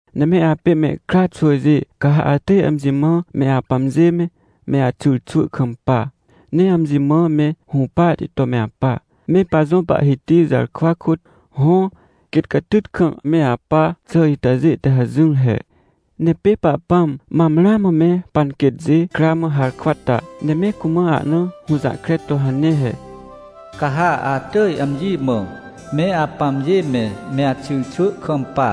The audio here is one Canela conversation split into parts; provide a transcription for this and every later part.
Ne me apê mehkra xwỳjê, ca ha atỳj amji mã me apãmjê me, me axyrxwỳ kampa, ne amji mã me hũpahti to me apa, me pajõ Pahhiti jarkwa kôt. Hõ, quêt catyt kam me apa xà itajê te hajỹr he. Ne pê Pahpãm mam ramã me panquêtjê kra mã harkwa ta, ne me cumã ahna hũjahkre to hane he: “Ca ha atỳj amji mã, me apãmjê me, me axyrxwỳ kampa,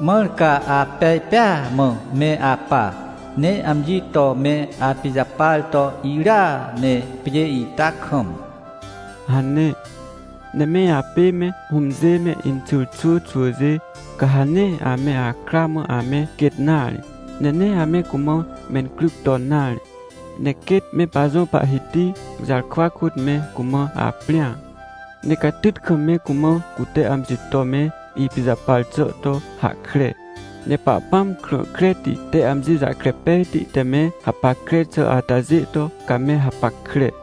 mãr ca apej pêa mã me apa, ne amji to me apijapar to irya ne, pjê ita kam” hane. Ne me apê me hũmjê me inxyrxwỳ xwỳjê, ca ha nee ame akra mã ame quêt nare, ne nee ame cumã mencryc ton nare. Ne quêt me pajõ Pahhiti jarkwa kôt me cumã aprĩa, ne catyt kam me cumã cute amji to me ipijapar xà to hahkre. Ne Pahpãm krã kreti te amji jahkre pejti te me hapackre xà atajê to, ca me hapackre.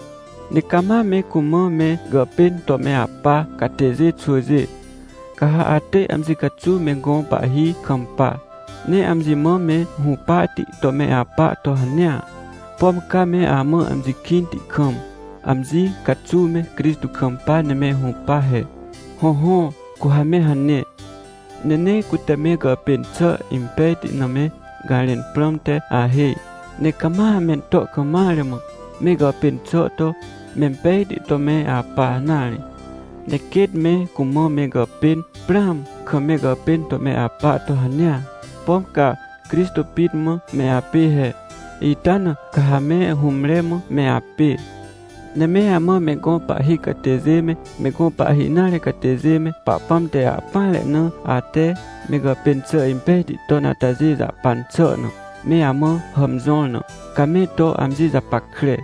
Ne cama me cumã me gàpên to me apa catêjê xwỳjê, ca ha atỳj amji caxuw me gõ pahhi kampa, ne amji mã me hũpahti to me apa to hanea, pom ca me amã amji kĩnti kam, amji caxuw me Crixtô kampa ne me hũpa he. Hõhõ, cu ha me hane. Ne nee cute me gàpên xà impejti na me garẽn prãmte ahêj, ne cama mento kam mare mã, me gàpên xà to mempejti to me apa nare. Ne quêt me cumã me gàpên prãam kam me gàpên to me apa to hanea, pom ca Crixtô pit mã me apê he. Ita na ca ha me hũmre mã me apê. Ne me amã me gõ pahhi catêjê me, me gõ pahhi nare catêjê me, Pahpãm te ahpỹanre na ate me gàpên xà impej ton atajê jahpan xà na, me amã hàmjõr na, ca me to amji japackre.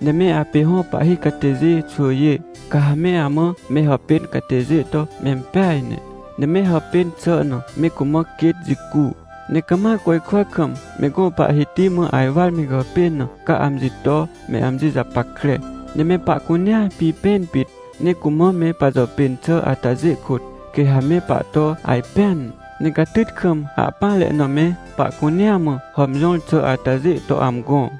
Ne me apê hõ pahhi catêjê xwỳjê, ca ha me amã me hàpên catêjê to mempeaj ne, ne me hàpên xà na me cumã quêt jicu. Ne cama côjkwa kam me gõ Pahhiti mã ajwar me gàpên na, ca amji to me amji japackre. Ne me pahcunea pipẽn pit, ne cumã me pajàpên xà atajê kôt, quê ha me pahto ajpẽan, ne catyt kam ahpỹanre na me pahcunea mã hàmjõr xà atajê to amgõ.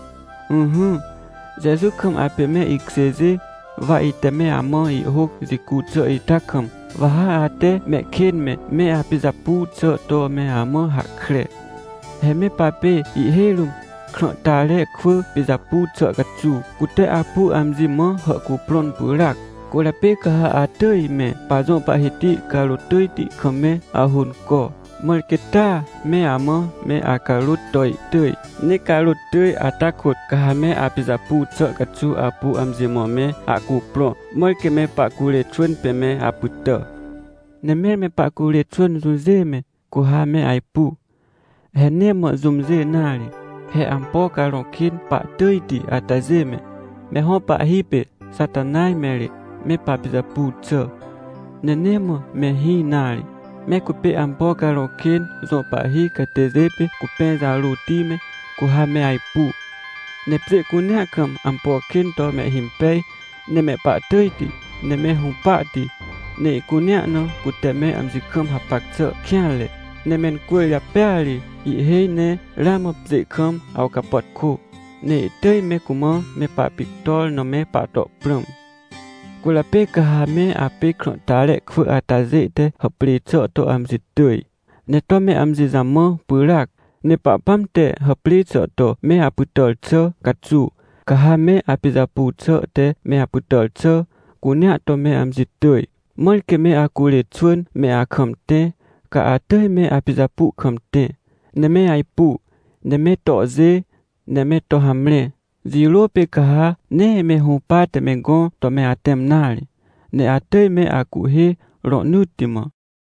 Ỹhỹ, Jeju kam apê me ikjêjê, wa ite me amã ihhôc jicu xà ita kam, wa ha ate mehkên me, me apijapu xà to me amã hahkre. He me papê ihhêj rũm krãhtare kwỳ pijapu xà caxuw, cute apu amji mã hàhcuprõn pyràac. Cwỳrjapê ca ha atỳj me pajõ Pahhiti carôt tỳjti kam me ahônco, mãr quê taa me amã me acarôt to ihtỳj. Ne carôt tỳj ata kôt ca ha me apijapu xà caxuw apu amji mã me ahcuprõ, mãr quê me pahcurê xwỳn pê me apytà. Ne mẽr me pahcurê xwỳn jũjê me, cu ha me ajpu? He nee mã jũmjê nare, he ampo carõ kên pahtỳjti atajê me, me hõ pahhi pê Xatanaj me ri me papijapu xà. Ne nee mã mehĩ nare, me cupê ampo carõ kên jõ pahhi catêjê pê cupẽ jarôti me, cu ha me ajpu. Ne pjê cunea kam ampo kên to mehhimpej, ne mehpahtỳjti, ne me hũpahti, ne ihcunea na cute me amji kam hapac xà kêanre. Ne mencwỳrjapêa ri ihhêj ne ramã pjê kam awcapàtkô, ne ihtỳj me cumã me papictor na me pahto prãm. Cwỳrjapê ca ha me apê krãhtare kwỳ atajê te hàprê xà to amji tỳj, ne to me amji jamã pyràac. Ne Pahpãm te hàprê xà to me apytàr xà caxuw, ca ha me apijapu xà te me apytàr xà cunea to me amji tỳj. Mãr quê me acurê xwỳn me akam tẽ, ca atỳj me apijapu kam tẽ, ne me ajpu, ne me tohjê, ne me to hamre. Jirô pê ca ha nee me hũpate me gõ to me atẽm nare, ne atỳj me acuhhê rohnỳtti mã.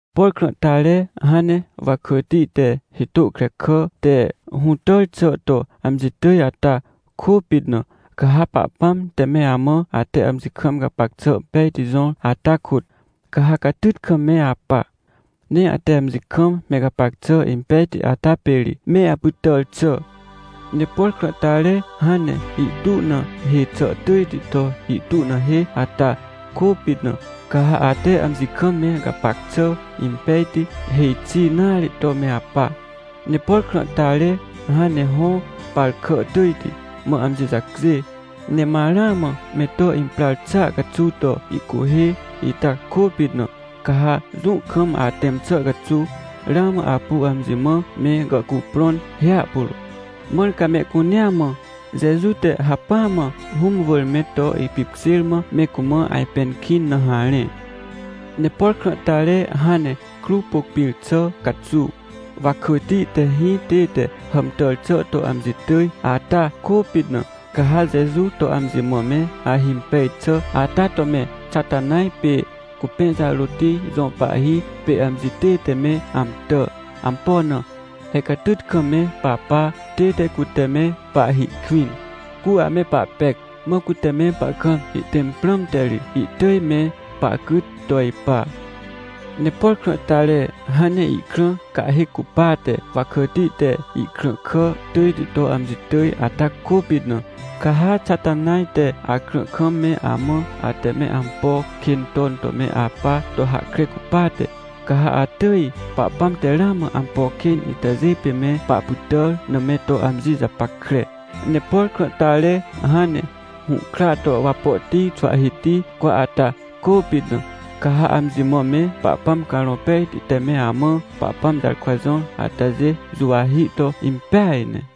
Por krãhtare hãn ne wakỳti te hitô krekà te hũtàr xà to amji tỳj ata kôpit na, ca ha Pahpãm te me amã ate amji kam gapac xà pejti jõr ata kôt, ca ha catyt kam me apa. Ne ate amji kam me gapac xà impejti ata pê ri me apytàr xà. Ne por krãhtare hãn ne ihtu na hê xà tỳjti to ihtu na hê ata kôpit na, ca ha ate amji kam me gapac xà impejti, hêj xi nare to me apa. Ne por krãhtare hãn ne hõ par kà tỳjti mã amji jacjê, ne ma ramã me to imprar xàa caxuw to ihcuhhê ita kôpit na, ca ha jũ kam atẽm xà caxuw, ramã apu amji mã me gàhcuprõn hiahpuro. Mãr ca mehcunea mã, Jeju te hacpỹa mã Hũm wỳr me to ipipkjêr mã me cumã ajpẽn kĩn na harẽ. Ne por krãhtare hãn ne kruw pôc pĩr xà caxuw, wakỳti te hĩ tête hàmtàr xà to amji tỳj ata kôpit na, ca ha Jeju to amji mã me ahimpej xà ata to me Xatanaj pê cupẽ jarôti jõ pahhi pê amji tête me amtà. Ampo na? He catyt kam me papa tête cute me pahhi kwĩn, cu ame pahpec, mã cute me pahkam ihtẽm prãmte ri ihtỳj me pahcyt to ipa. Ne por krãhtare hãn ne ihkrã cahhêc cupate wakỳti te ihkrãhkà tỳjti to amji tỳj ata kôpit na, ca ha Xatanaj te akrã kam me amã ate me ampo kên ton to me apa to hahkre cupate, ca ha atỳj Pahpãm te ramã ampo kên itajê pê me pahpytàr na me to amji japackre. Ne por krãhtare hãn ne hũhkra to wapohti xwahhihti cwa ata kôpit na, ca ha amji mã me Pahpãm Carõ Pejti te me amã Pahpãm jarkwa jõr atajê juwahi to impeaj ne.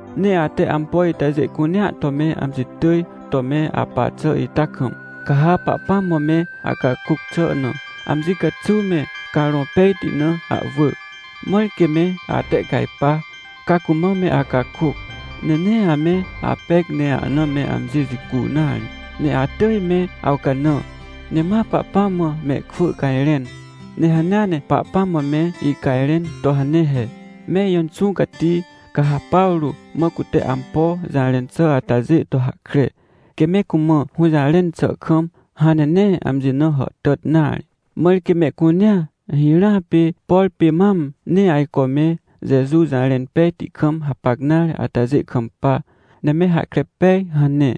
Ne ate ampo itajê cunea to me amji tỳj to me apa xà ita kam, ca ha Pahpãm mã me acakôc xà na, amji caxuw me Carõ Pejti na ahwỳ, mãr quê me atehcajpa, ca cumã me acakôc. Ne nee ame apec ne ahna me amji jicu nare, ne atỳj me awcanã, ne ma Pahpãm mã mehkwỳ cajrẽn. Ne hanea ne Pahpãm mã me icajrẽn to hane he: — Me ijõ Inxũ Cati, ca ha Pawrô mã cute ampo jarẽn xà atajê to hahkre, quê me cumã hũjarẽn xà kam hãn ne nee amji na hàhtàt nare, mãr quê mehcunea, hirãa pê, por pê mam nee ajco me Jeju jarẽn pejti kam hapac nare atajê kampa, ne me hahkre pej — hane.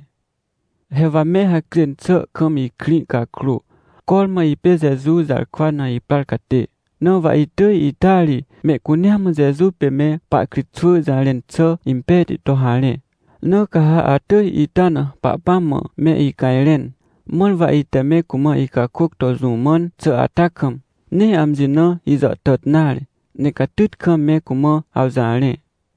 He wa me hacjên xà kam ikrĩ cakrô, cormã ipê Jeju jarkwa na iprar catê, na wa itỳj ita ri mehcunea mã Jeju pê me pahkritxwỳ jarẽn xà impejti to harẽ. Na ca ha atỳj ita na Pahpãm mã me icajrẽn, mãr wa ite me cumã icakôc to jũ mãn xà ata kam, nee amji na ijàhtàt nare, ne catyt kam me cumã awjarẽ.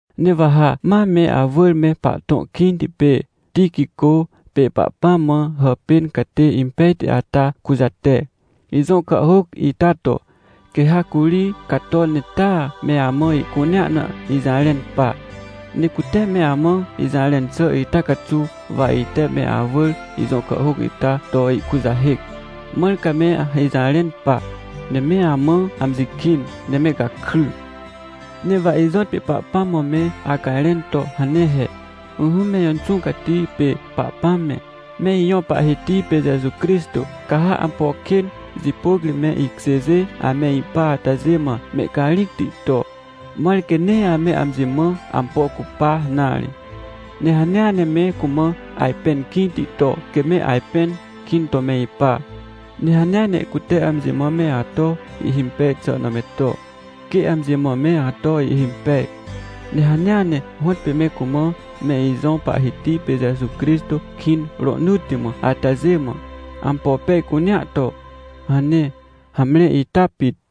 Ne wa ha ma me awỳr me pahtõ kĩnti pê Tiquicô pê Pahpãm mã hàpên catê impejti ata kujate, ijõ kàhhôc ita to. Quê ha curi cato ne taa me amã ihcunea na ijarẽn pa. Ne cute me amã ijarẽn xà ita caxuw wa ite me awỳr ijõ kàhhôc ita to ihkujahêc, mãr ca me ijarẽn pa, ne me amã amji kĩn, ne me gakry. Ne wa ijõtpê Pahpãm mã me acajrẽn to hane he: — Ỹhỹ me ijõ Inxũ Cati pê Pahpãm me, me ijõ Pahhiti pê Jeju Crixtô, ca ha ampo kên jipôc ri me ikjêjê ame ipa atajê mã mehcarĩcti to, mãr quê nee ame amji mã ampo cupa nare. Ne hanea ne me cumã ajpẽn kĩnti to, quê me ajpẽn kĩn to me ipa. Ne hanea ne cute amji mã me ato ihhimpej xà na me to, quê amji mã me ato ihhimpej. Ne hanea ne hõtpê me cumã me ijõ Pahhiti pê Jeju Crixtô kĩn rohnỳtti mã atajê mã, ampo pej cunea to — hane. Hamre, ita pit.